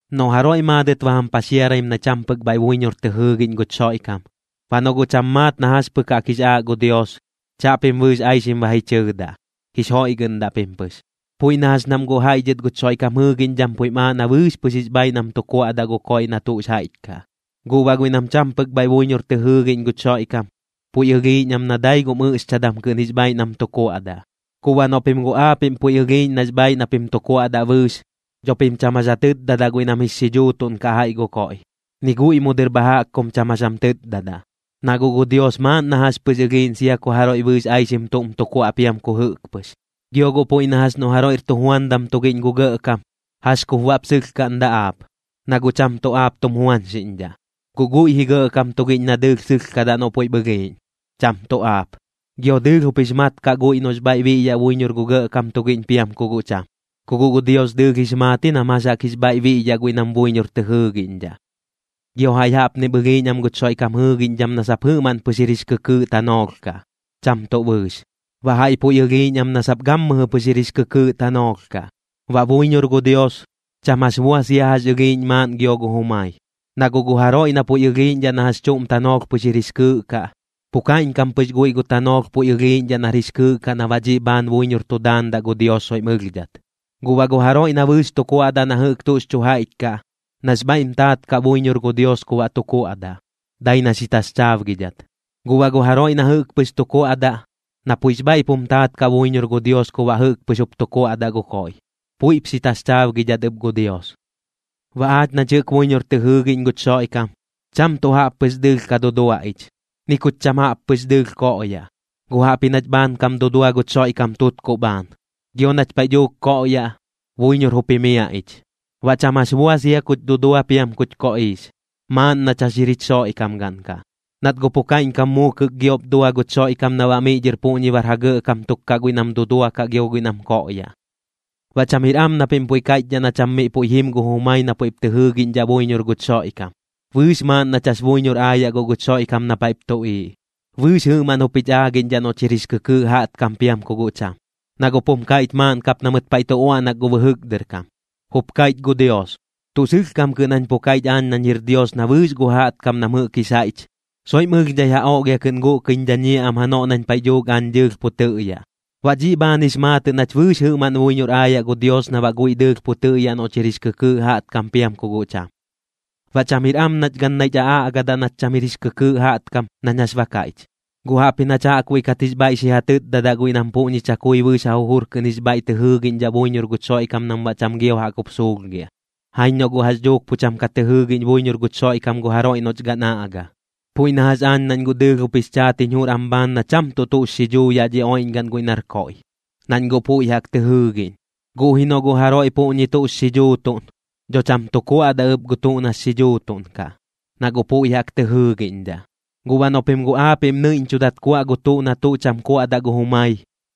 Noꞌ jaroiꞌ maadɨt ba jam paxiaraim na cham pɨk bhaiꞌ buiñor tɨ jɨɨgiꞌñ guch Xoiꞌkam, baꞌ noꞌ guꞌ cham maat na jax pɨk jaꞌk jix aaꞌ gu Dios, chaꞌpim bɨɨx aixim ba ji chɨɨdaꞌ, jix joiꞌgɨꞌndaꞌ pim pɨx. Puiꞌ na jax nam guꞌ jaiꞌ dhɨt guch Xoiꞌkam jɨɨgiꞌñdham puiꞌm aaꞌ na bɨɨx pɨx jix bhaaiꞌ nam tu kuaꞌdaꞌ gu koiꞌ na tuꞌx jaiꞌch kaꞌ, guꞌ baꞌ guiꞌ nam cham pɨk bhaiꞌ buiñor tɨ jɨɨgiꞌñ guch Xoiꞌkam, puiꞌ ɨlhiiꞌñ am na dai gum ɨꞌxchadam kɨꞌn jix bhaaiꞌ nam tu kuaꞌdaꞌ. Guꞌ baꞌ noꞌ pim guꞌ aapiꞌm puiꞌ ɨlhiiꞌñ nax bhaaiꞌ na pim tu kuaꞌdaꞌ bɨɨx, dho pim cham jax ja tɨtdadaꞌ guiꞌ nam jix xidhuutuꞌn kaꞌ jaiꞌ gu koiꞌ, ni guiꞌ mu dɨr bha jaꞌk kum cham jax jam tɨtdadaꞌ, na guꞌ gu Dios maaꞌn na jax pɨx ɨlhiiꞌñ sia ku jaroiꞌ bɨɨx aixim tuꞌm tu kuaꞌ piam ku jɨꞌk pɨx. Gio guꞌ puiꞌ na jax noꞌ jaroiꞌr tujuandam tugiꞌñ gu gɇꞌkam, ¿jax kup baꞌp sɨlhkaꞌndaꞌ aap, na guꞌ cham tuꞌ aap tum juañxiꞌñdhaꞌ? Guꞌ guiꞌ ji gɇꞌkam tugiꞌñ na dɨɨlh sɨlhkadaꞌ noꞌ puiꞌp ɨlhiiꞌñ, cham tuꞌ aap. Gio dɨɨlh jup jix maat kaꞌ guiꞌ noꞌx bhaiꞌ biꞌyaꞌ buiñor gu gɇꞌkam tugiꞌñ piam ku guꞌ cham. Ku guꞌ gu Dios dɨɨlh jix maat ji nam jax jaꞌk jix bhaiꞌ biꞌyaꞌ guiꞌ nam buiñor tɨ jɨɨgiꞌñdhaꞌ. Gio jaiꞌ jaꞌpnip ɨlhiiꞌñ am guch Xoiꞌkam jɨɨgiꞌñdham na sap jɨꞌmaꞌn pɨx jir jix kɨkɨɨꞌ tanoolh kaꞌ, cham tuꞌ bɨɨx, baꞌ jaiꞌ puiꞌ ɨlhiiꞌñ am na sap gammɨjɨ pɨx jir jix kɨkɨɨꞌ tanoolh kaꞌ. Baꞌ buiñor gu Dios, cham jax bua sia jax ɨlhiiꞌñ maaꞌn gio gu jumai. Na guꞌ gu jaroiꞌ na puiꞌ ɨlhiiꞌñdhaꞌ na jax chuꞌm tanoolh pɨx jir jix kɨɨꞌ kaꞌ, pu kaiꞌñkam pɨx guiꞌ gu tanoolh puiꞌ ɨlhiiꞌñdhaꞌ nar jix kɨɨꞌ kaꞌ na baꞌ dhiꞌ bhaan buiñor tu daandaꞌ gu Dios soiꞌm ɨlhdhat. Guꞌ baꞌ gu jaroiꞌ na bɨɨx tu kuaꞌdaꞌ na jɨꞌk tuꞌx chu jaiꞌch kaꞌ, nax bhaiꞌm taat kaꞌ buiñor gu Dios ku baꞌ tu kuaꞌdaꞌ, dai na xi taxchaabgidhat. Guꞌ baꞌ gu jaroiꞌ na jɨꞌk pɨx tu kuaꞌdaꞌ, na puiꞌx bhaiꞌp jum taat kaꞌ buiñor gu Dios ku baꞌ jɨꞌk pɨx jup tu kuaꞌdaꞌ gu koiꞌ, puiꞌp xi taxchaabgidhat ɨp gu Dios. Baꞌ aach nach jɨꞌk buiñor tɨ jɨɨgiꞌñ guch Xoiꞌkam, cham tuꞌ jaꞌp pɨx dɨɨlh ka dudua ich, ni kuch cham jaꞌp pɨx dɨɨlh koꞌyaꞌ. Guꞌ jaꞌpji nach bhaankam dudua guch Xoiꞌkam tutkuꞌ bhaan, gio nach paiꞌ dhuuk koꞌyaꞌ, buiñor jup jimiaꞌ ich. Baꞌ cham jax bua sia kuch dudua piam kuch koꞌiix, maaꞌn nach jax jir jich Xoiꞌkamgaꞌn kaꞌ. Nat guꞌ pu kaiꞌñkam muukɨk giop dua guch Xoiꞌkam na baꞌ miꞌ dhɨr puꞌñi bar ja gɇꞌkam tuk kaꞌ guiꞌ nam duduakaꞌ gio guiꞌ nam koꞌyaꞌ. Baꞌ cham jir am na pim puiꞌ kaiꞌchdhaꞌ na cham miꞌ puiꞌ jim gu jumai na puiꞌ tɨip tɨ jɨɨgiꞌñdhaꞌ buiñor guch Xoiꞌkam. Bɨɨx maaꞌn nach jax buiñor aayaꞌ guꞌ guch Xoiꞌkam na paiꞌp tuꞌiiꞌ, bɨɨx jɨꞌmaꞌn jup jich aagiꞌñdhaꞌ noꞌch jir jix kɨkɨɨꞌ jaꞌtkam piam ku guꞌ cham. Na guꞌp jum kaiꞌch maaꞌn kap na mɨt paiꞌ tu uaꞌnak gu bɨjɨk dɨr kam: Jup kaiꞌch gu Dios: Tuꞌ sɨlhkam kɨꞌn jañ pu kaiꞌch aañ nañ jir Dios na bɨɨx gu jaꞌtkam nam jɨꞌk jix jaiꞌch, soiꞌm ɨlhdhai ja oꞌlhia kɨꞌn guꞌkɨiñ dhañiaꞌ am janoꞌ nañ paiꞌ dhuuk aañ dɨɨlh pu tɨꞌyaꞌ. Baꞌ dhiꞌ bhaan jix maatɨꞌ nach bɨɨx jɨꞌmaꞌn buiñor aayaꞌ gu Dios na baꞌ guiꞌ dɨɨlh pu tɨꞌyaꞌ noꞌch jir jix kɨkɨɨꞌ jaꞌtkam piam ku guꞌ cham. Baꞌ cham jir am nach gan naiꞌch aꞌaꞌgadaꞌ nach cham jir kɨkɨɨꞌ jaꞌtkam nañ jax ba kaiꞌch, guꞌ jaꞌpji nach jaꞌkbuiꞌ kat jix bhaiꞌ xi ja tɨtdadaꞌ guiꞌ nam puꞌñi chakui bɨɨx ja jujur kɨꞌn jix bhaiꞌ tɨ jɨɨgiꞌñdhaꞌ buiñor guch Xoiꞌkam nam baꞌ cham gio jaꞌk jup suulhgiaꞌ, jaiñ noꞌ guꞌ jax dhuuk pu cham ka tɨ jɨɨgiꞌñ buiñor guch Xoiꞌkam gu jaroiꞌ noꞌch gan aꞌga. Puiꞌ na jax aañ nañ guꞌ dɨɨlh jup jix chaat jiñ jur am bhaan na cham tuꞌ tuꞌx xidhuu yaꞌ dhi oiꞌñgaꞌn guiꞌ nar koiꞌ, nañ guꞌ puiꞌ jaꞌk tɨ jɨɨgiꞌñ. Guꞌ ji noꞌ guꞌ jaroiꞌ puꞌñi tuꞌx xidhuutuꞌn, dho cham tuꞌ kuadaꞌ ɨp gu tuꞌ nax xidhuutuꞌn kaꞌ, na guꞌ puiꞌ jaꞌk tɨ jɨɨgiꞌñdhaꞌ. Guꞌ baꞌ noꞌ pim guꞌ aapiꞌm nɨiꞌñchudat kuaꞌ gu tuꞌ na tuꞌ cham kuaꞌdaꞌ gu jumai,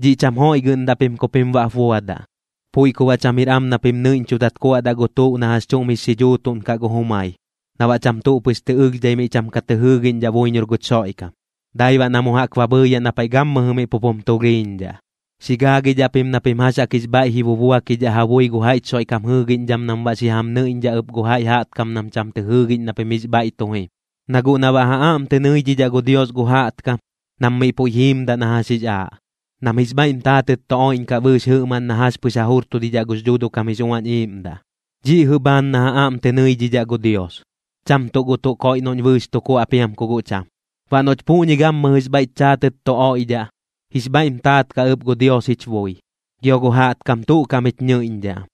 dhiꞌ cham joiꞌgɨꞌndaꞌ pim ku pim baꞌp buadaꞌ. Puiꞌ ku baꞌ cham jir am na pim nɨiꞌñchudat kuaꞌdaꞌ gu tuꞌ na jax chuꞌm jix xidhuutuꞌn kaꞌ gu jumai, na baꞌ cham tuꞌ pɨx tɨ ɨlhdhai miꞌ cham ka tɨ jɨɨgiꞌñdhaꞌ buiñor guch Xoiꞌkam, dai baꞌ na mu jaꞌk ba bhɨɨyaꞌ na paiꞌ gammɨjɨ miꞌ pup jum tulhiiñdhaꞌ. Xi gaagidhaꞌ pim na pim jax jaꞌk jix bhaiꞌ ji bubuakidhaꞌ ja bui gu jaiꞌch Xoiꞌkam jɨɨgiꞌñdham nam baꞌ xi jam nɨiꞌñdhaꞌ ɨp gu jaiꞌ jaꞌtkam nam cham tɨ jɨɨgiꞌñ na pim jix bhaiꞌ tu jim. Na guꞌ na baꞌ ja aꞌm tɨ nɨidhidhaꞌ gu Dios gu jaꞌtkam, nam miꞌ puiꞌ jiimdaꞌ na jax jix aaꞌ, nam jix bhaiꞌm taatɨt tu oiꞌñkaꞌ bɨɨx jɨꞌmaꞌn na jax pɨx ja jurtudhidhaꞌ gux Dhuuduꞌ kam jix Uañ Iiꞌmdaꞌ, dhiꞌ jɨꞌ bhaan na ja aꞌm tɨ nɨidhidhaꞌ gu Dios, cham tuꞌ gu tuꞌ koiꞌ noꞌñ bɨɨx tu kuaꞌ piam ku guꞌ cham. Baꞌ noꞌch puꞌñi gammɨjɨx bhaiꞌch chaatɨt tu oiꞌdhaꞌ, jix bhaiꞌm taat kaꞌ ɨp gu Dios jich bui, gio gu jaꞌtkam tu kaꞌm jich nɨiꞌñdhaꞌ am.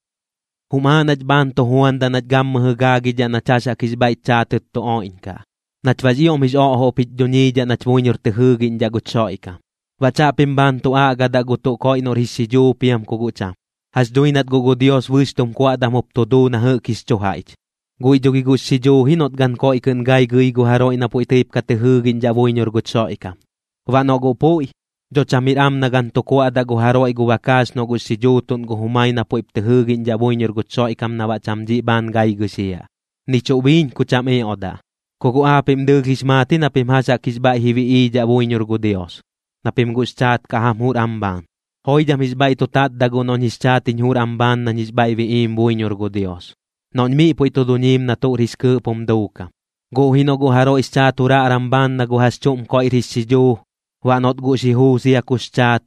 Jum aaꞌ nach bhaan tu juandaꞌ nach gammɨjɨ gaagidhaꞌ nach jax jaꞌk jix bhaiꞌch chaatɨt tu oiꞌñkaꞌ, nach baꞌx ioꞌm jix oꞌjoꞌp jich dhuñiidhaꞌ nach buiñor tɨ jɨɨgiꞌñdhaꞌ guch Xoiꞌkam. Baꞌ chaꞌpim bhaan tu aꞌgadaꞌ gu tuꞌ koiꞌ noꞌr jix xidhuu piam ku guꞌ cham. Jax dhui nat guꞌ gu Dios bɨɨx tum kuaꞌdam jup tu duu na jɨꞌk jix chu jaiꞌch. Guiꞌ dho gi guꞌx xidhuu ji noꞌt gan koiꞌ kɨꞌn gai gɨi gu jaroiꞌ na puiꞌ tɨip ka tɨ jɨɨgiꞌñdhaꞌ buiñor guch Xoiꞌkam. Baꞌ noꞌ guꞌ puiꞌ, dho cham jir am na gan tu kuaꞌdaꞌ gu jaroiꞌ gu bakaax noꞌ guꞌx xi dhuutuꞌn gu jumai na puiꞌp tɨ jɨɨgiꞌñdhaꞌ buiñor guch Xoiꞌkam na baꞌ cham dhiꞌ bhaan gai gɨxiaꞌ, ni chuꞌ biiñ ku cham ioꞌdaꞌ. Ku guꞌ aapiꞌm dɨɨlh jix maat ji na pim jax jaꞌk jix bhaiꞌ ji biꞌiidhaꞌ buiñor gu Dios, na pim guꞌx chaat kaꞌ jam jur am bhaan. Joidham jix bhaiꞌ tu tatdaꞌ guꞌ noꞌñ jix chaat jiñ jur am bhaan nañ jix bhaiꞌ biꞌiim buiñor gu Dios, noꞌñ miꞌ puiꞌ tu duñiim na tuꞌr jix kɨɨꞌp jum duukam. Guꞌ ji noꞌ guꞌ jaroiꞌx chaat juraꞌram bhaan na gu jax chuꞌm koiꞌr jix xidhuu, baꞌ noꞌt guꞌ xi juu sia kux chaat,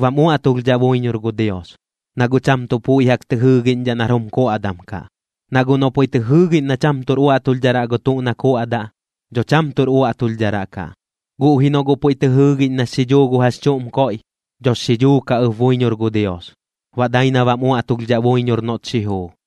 bam uaꞌtulhdhaꞌ buiñor gu Dios, na guꞌ cham tuꞌ puiꞌ jaꞌk tɨ jɨɨgiꞌñdhaꞌ nar jum kuaꞌdam kaꞌ. Na guꞌ noꞌ puiꞌ tɨ jɨɨgiꞌñ na cham tuꞌr uaꞌtulhdharaꞌ gu tuꞌ na kuaꞌdaꞌ, dho cham tuꞌr uaꞌtulhdharaꞌ kaꞌ, guꞌ ji noꞌ guꞌ puiꞌ tɨ jɨɨgiꞌñ nax xidhuu gu jax chuꞌm koiꞌ, dhox xi dhuu kaꞌ ɨp buiñor gu Dios, baꞌ dai na bam uaꞌtulhdhaꞌ buiñor noꞌt xi juu.